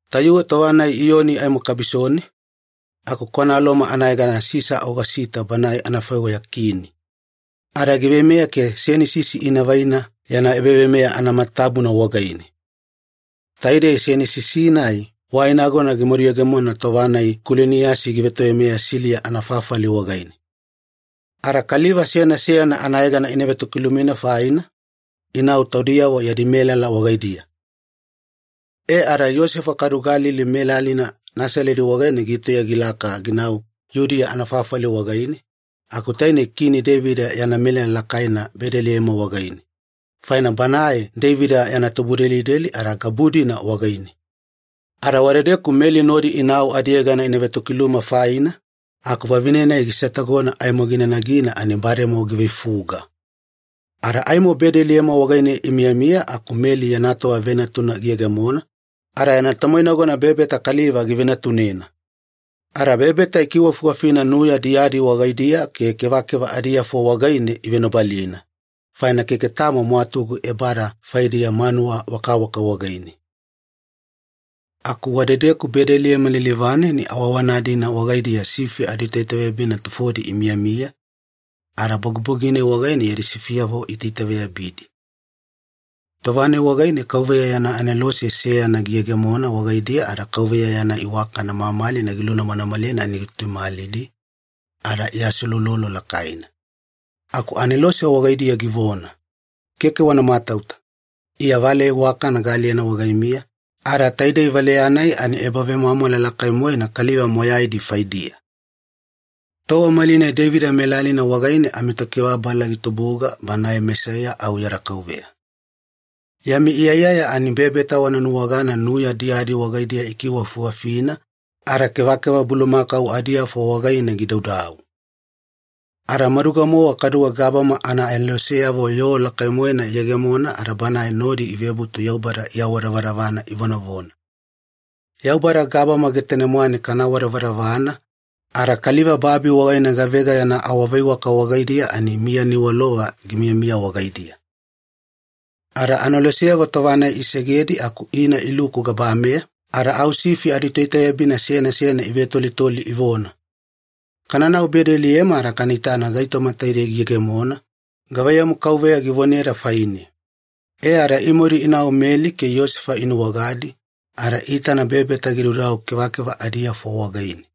Tayuwe tova-nai Iyoni aimo kabisone, aku kwana Loma anayegana Sisa Ogosita banae anafaiweya kini, ada giveimeya ke senisisi ina vaina yana ebaveimeya anamatatabuna wagaine. Taidei senisisi-nai wai nagona gimaduyegemona tova-nai Kuliniyasi givetoveimeya Siliya anafafali wagaine. Ada kaliva seyana seyana anayegana ina vetokilumina faina, inau taudiyavo yadi melala wagaidiya. E ada Iyosefa kaduwe Galili melalina Nasaledi wagaine gitauya gilaka ginau Yudiya anafafali wagaine, aku tainei Kini Deivida yana melala lakaina Bedeliema wagaine, faina banae Deivida yana tubudelideli ada gabu-dina wagaine. Ada wadedeku Meli nodi inau adiyegana ina vetokiluma faina, aku vavine-nai gisetagona aimo gina nagina ani bademowa giveifuga. Ada aimo Bedeliema wagaine imiyamiya aku Meli yana tova venatuna giyegemona, ada yana tomoinagona bebeta kaliva givenatunena. Ada bebeta ikiwafiwafina nuya diyadi wagaidiya ke kevakeva adiafo wagaine ivenobalina, faina keke tamo mwatugu ebada faidiya manuwa wakawaka wagaine. Aku wadedeku Bedeliema lilivane ani awaawana-dina wagaidiya sifi aditoitaveyabina tufodi imiyamiya, ada bogibogi-nai wagaine yadi sifiyavo iitaitaveyabidi. Tova-nai wagaine KAUVEYA yana anelose seyana giyegemona wagaidiya ada Kauveya yana iwakana mamalina gilunamanamalena ani gituimalidi, ada iaseulolo lakaina. Aku anelose wagaidiya givona, “Keke wana matauta. Iya valeya iwakana gaaliyena wagaimiya, ada taidei valeya-nai ani ebavemwamwala lakai-moena kaliva moyaidi faidiya. Tova malinai Deivida melalina wagaine amiTokibababala gitubuga, Banae Mesaiya au yada Kauveya. Yami iyaiyaya ani bebeta wana nuwagana nuya diyadi wagaidiya ikiwakiwafina, ada kevakeva bulumakau adiafo wagaine gidaudau.” Ada maduga-mowa kaduwe gabama anaaneloseyavo yoo lakai-moena iyegemona ada banae nodi ivebutu Yaubada iawadavadavana ivonavona, “Yaubada gabama getane-mwane kana awadavadavana, ada kaliva babi wagaine gavega yana awaveiwaka wagaidiya ani miya niwalova gimiyamiya wagaidiya.” Ada aneloseyavo tova-nai isegedi aku ina iluku gabameya, ada au sifi aditoitaveyabina seyana seyana ivetolitoli ivona, “Kananau Bedeliema ada kana itana gaitoma taidei giyegemona, gavaiyamu Kauveya givoneda faine.” E ada imadu inau Meli ke Iyosefa inuwagadi, ada iitana bebeta gidaudau kevakeva adiafo wagaine.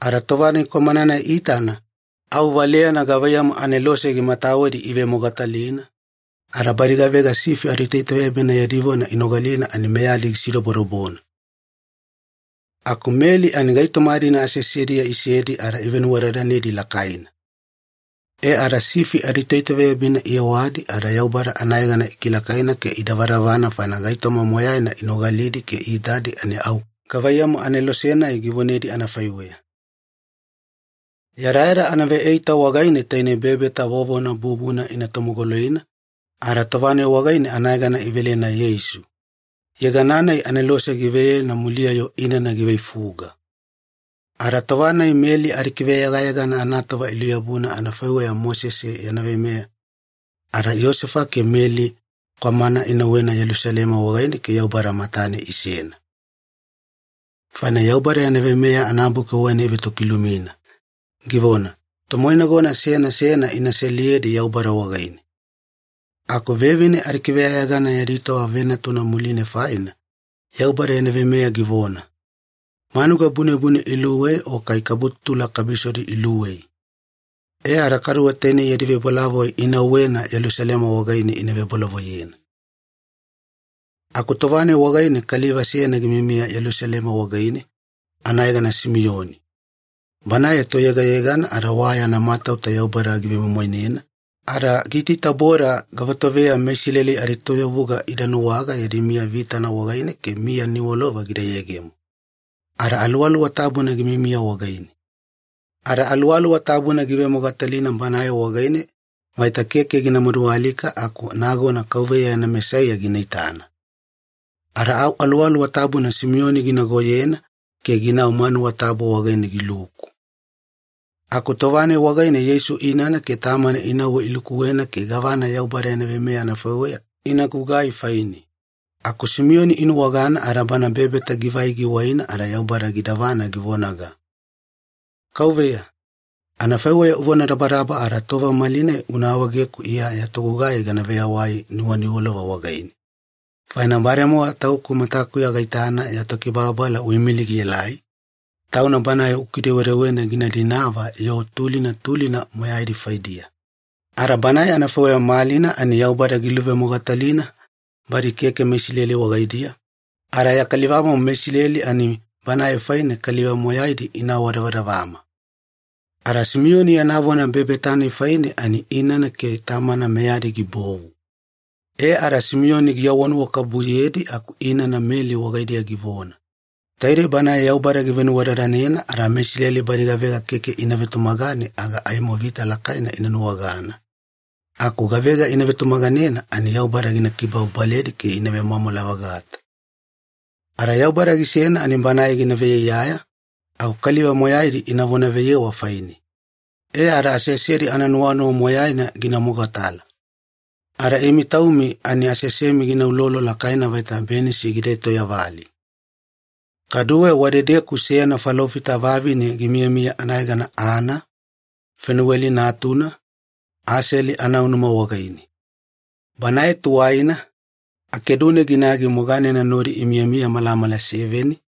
Ada tova-nai kwamana-nai iitana, au valeyana gavaiyamu anelose gimatawedi ivemogatalina, ada badi gavega sifi aditoitaveyabina yadi vona inogalina ani meyadi gisidobodobona. Aku Meli ani gaitoma-dina aseasediya isedi ada ivenuwadadanedi lakaina. E ada sifi aditoitaveyabina iyewadi ada Yaubada anayegana ikilakaina ke idavadavana faina gaitoma moyaina inogalidi ke iitadi ani au gavaiyamu anelose-nai givonedi anafaiweya. Yadayada anaveeita wagaine tainei bebeta vovona bubuna ina tomogoloina, ada tova-nai wagaine anayegana ivelena Yeisu, yegana-nai anelose givelena muliya-yo inana giveifuga. Ada tova-nai Meli adikiveyegayegana anatova iluyabuna anafaiweya Mosese yana veimeya, ada Iyosefa ke Meli kwamana inauwena Yelusalema wagaine ke Yaubada matane inasena. Faina Yaubada yana Veimeya anabuki wagaine ivetokilumina, givona, “Tomoinagona seyana seyana ina seliyedi Yaubada wagaine.” Aku vevine adikiveyegayegana yadi tova venatuna muline faina, Yaubada yana veimeya givona, “Manuga bunebune iluwei o kai kabututula kabisodi iluwei.” E ada kaduwe tainei yadi vebolavoi inauwena Yelusalema wagaine ina vebolavoiyena. Aku tova-nai wagaine kaliva seyana gimiyamiya Yelusalema wagaine, anayegana Simiyoni. Banae toyegayegana ada wa yana matauta Yaubada givemoimoinena, ada giitaitaboda gavatoveya meIsileli adietoyavuga ida nuwaga yadi miya vitana wagaine ke miya niwalova gida yegemo. Ada Aluwaluwa Tabuna gimiyamiya wagaine. Ada Aluwaluwa Tabuna giivemogatalina banae wagaine vaita keke gina madualika aku nagona Kauveya yana Mesaiya gina itana. Ada au Aluwaluwa Tabuna Simiyoni ginagoyena ke ginau manuwa tabu wagaine giluku. Aku tova-nai wagaine Yeisu inana ke tamana inauwe ilukuwena ke gavana Yaubada yana veimeya anafaiweya ina gugai faine, aku Simiyoni inuwagana ada bana bebeta givai giwaina ada Yaubada gidavana givonaga, “Kauveya, anafaiweya uvonadabadaba ada tova malinai una awaegeku Iya ya togugai gana veyawai nuwaniwalova wagaine. Faina bademowa tauku matakuya gaitana ya Tokibababala uimilina gielai, Tauna Banae ukidewedewena gina dinava yoo tulina tulina moyaidi faidiya. Ada Banae anafaiweya malina ani Yaubada giluvemogatalina badi keke meIsileli wagaidiya, ada ya kalivamomo meIsileli ani Banae faine kaliva moyaidi ina awadavadavama.” Ada Simiyoni yana vona bebeta-nai faine ani inana ke tamana meyadi gibovu. E ada Simiyoni giawanuwakabubuyedi aku inana Meli wagaidiya givona, “Taidei Banae Yaubada givenuwadadanena ada meIsileli badi gavega keke ina vetumagane aga aimo vita lakaina ina nuwagana, aku gavega ina vetumaganena ani Yaubada gina kibababaledi ke ina vemwamwala-vagata. Ada Yaubada gisena ani Banae gina veiyaiyaya, aku kaliva moyaidi ina vonaveyewa faine, e ada aseasedi ananuwanuwa moyaina gina mogatala. Ada imi taumi ani aseasemi gina ulolo lakaina vaita benisi gida etoyavali.” Kaduwe wadedeku seyana falofita vavine gimiyamiya anayegana Ana, Fenuweli natuna, Aseli anaunuma wagaine. Banae tuwaina, akedune ginagi moganena nodi imiyamiya malamala seveni,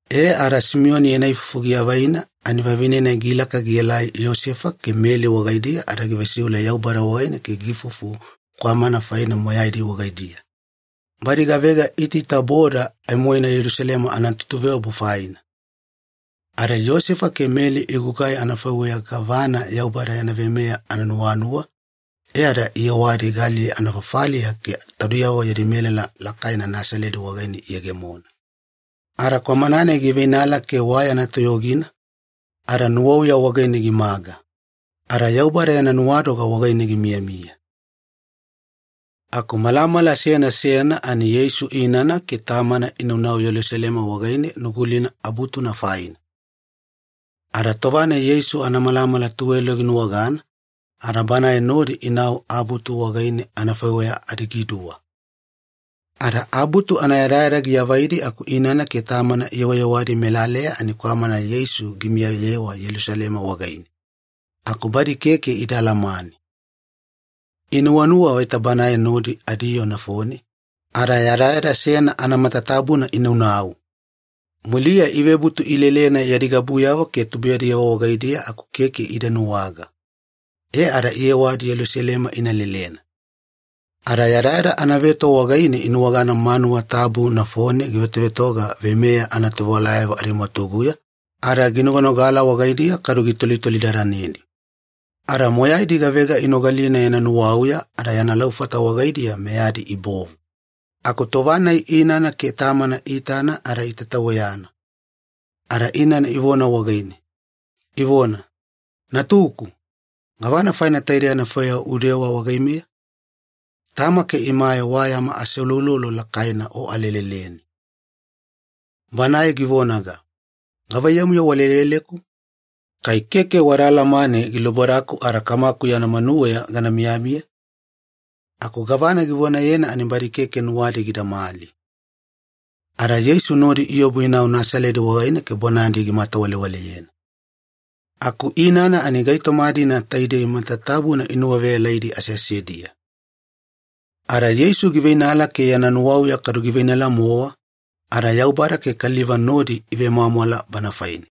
E ada Simiyoni yana ifufu giavaina ani vavine-nai gilaka gielai Iyosefa ke Meli wagaidiya ada givesiule Yaubada wagaine ke giifufu kwamana faine moyaidi wagaidiya, badi gavega iitaitaboda aimoina Yelusalema anatutuveobu faina. Ada Iyosefa ke Meli igugai anafaiweya gavana Yaubada yana veimeya ananuwanuwa, e ada iyewadi Galili anafafaliya ke taudiyavo yadi melala lakaina Nasaledi wagaine iyegemona. Ada kwamana-nai giveinala ke wa yana toyogina, ada nuwauya wagaine gimaga. Ada Yaubada yana nuwadoga wagaine gimiyamiya. Aku malamala seyana seyana ani Yeisu inana ke tamana inaunau Yelusalema wagaine Nugulina Abutuna faina. Ada tova-nai Yeisu anamalamala tuwelo ginuwagana, ada banae nodi inau Abutu wagaine anafaiweya adigiduwa. Ada Abutu anayadayada giavaidi aku inana ke tamana iyewayewadi melaleya ani kwamana Yeisu gimiyayewa Yelusalema wagaine, aku badi keke ida alamane. Inuwanuwa vaita banae nodi adiyoo nafone, ada yadayada seyana anamatatabuna inaunau. Muliya ivebutu ilelena yadi gabuyavo ke tubuiyadiyavo wagaidiya aku keke ida nuwaga, e ada iyewadi Yelusalema ina lelena. Ada yadayada anaveto wagaine inuwagana manuwa tabu nafone givetovetoga veimeya anatovewalayavo adimwatuguya, ada ginoganogala wagaidiya kadu gitolitolidadanedi. Ada moyaidi gavega inogalina yana nuwauya ada yana laufata wagaidiya meyadi ibovu. Aku tova-nai inana ke tamana iitana ada itataweyana, ada inana ivona wagaine, ivona, “Natuku, gavana faina taidei anafaiweya udewa wagaimeya? Tama ke imae wa yama aseuloulolo lakaina o aleleleni.” Banae givonaga, “Gavaiyamu-yo waleleleku? Kai keke wada alamane gilubodaku ada Kamaku yana manuweya gana miyamiya?” Aku gavana givonayena ani badi keke nuwadi gidamali. Ada Yeisu nodi iobu inau Nasaledi wagaine ke bonadi gimatawalewaleyena. Aku inana ani gaitoma-dina taidei matatabuna inuwaveyalaidi aseasediya. Ada Yeisu giveinala ke yana nuwauya kadu giveinala-mowa, ada Yaubada ke kaliva nodi ivemwamwala Bana faine.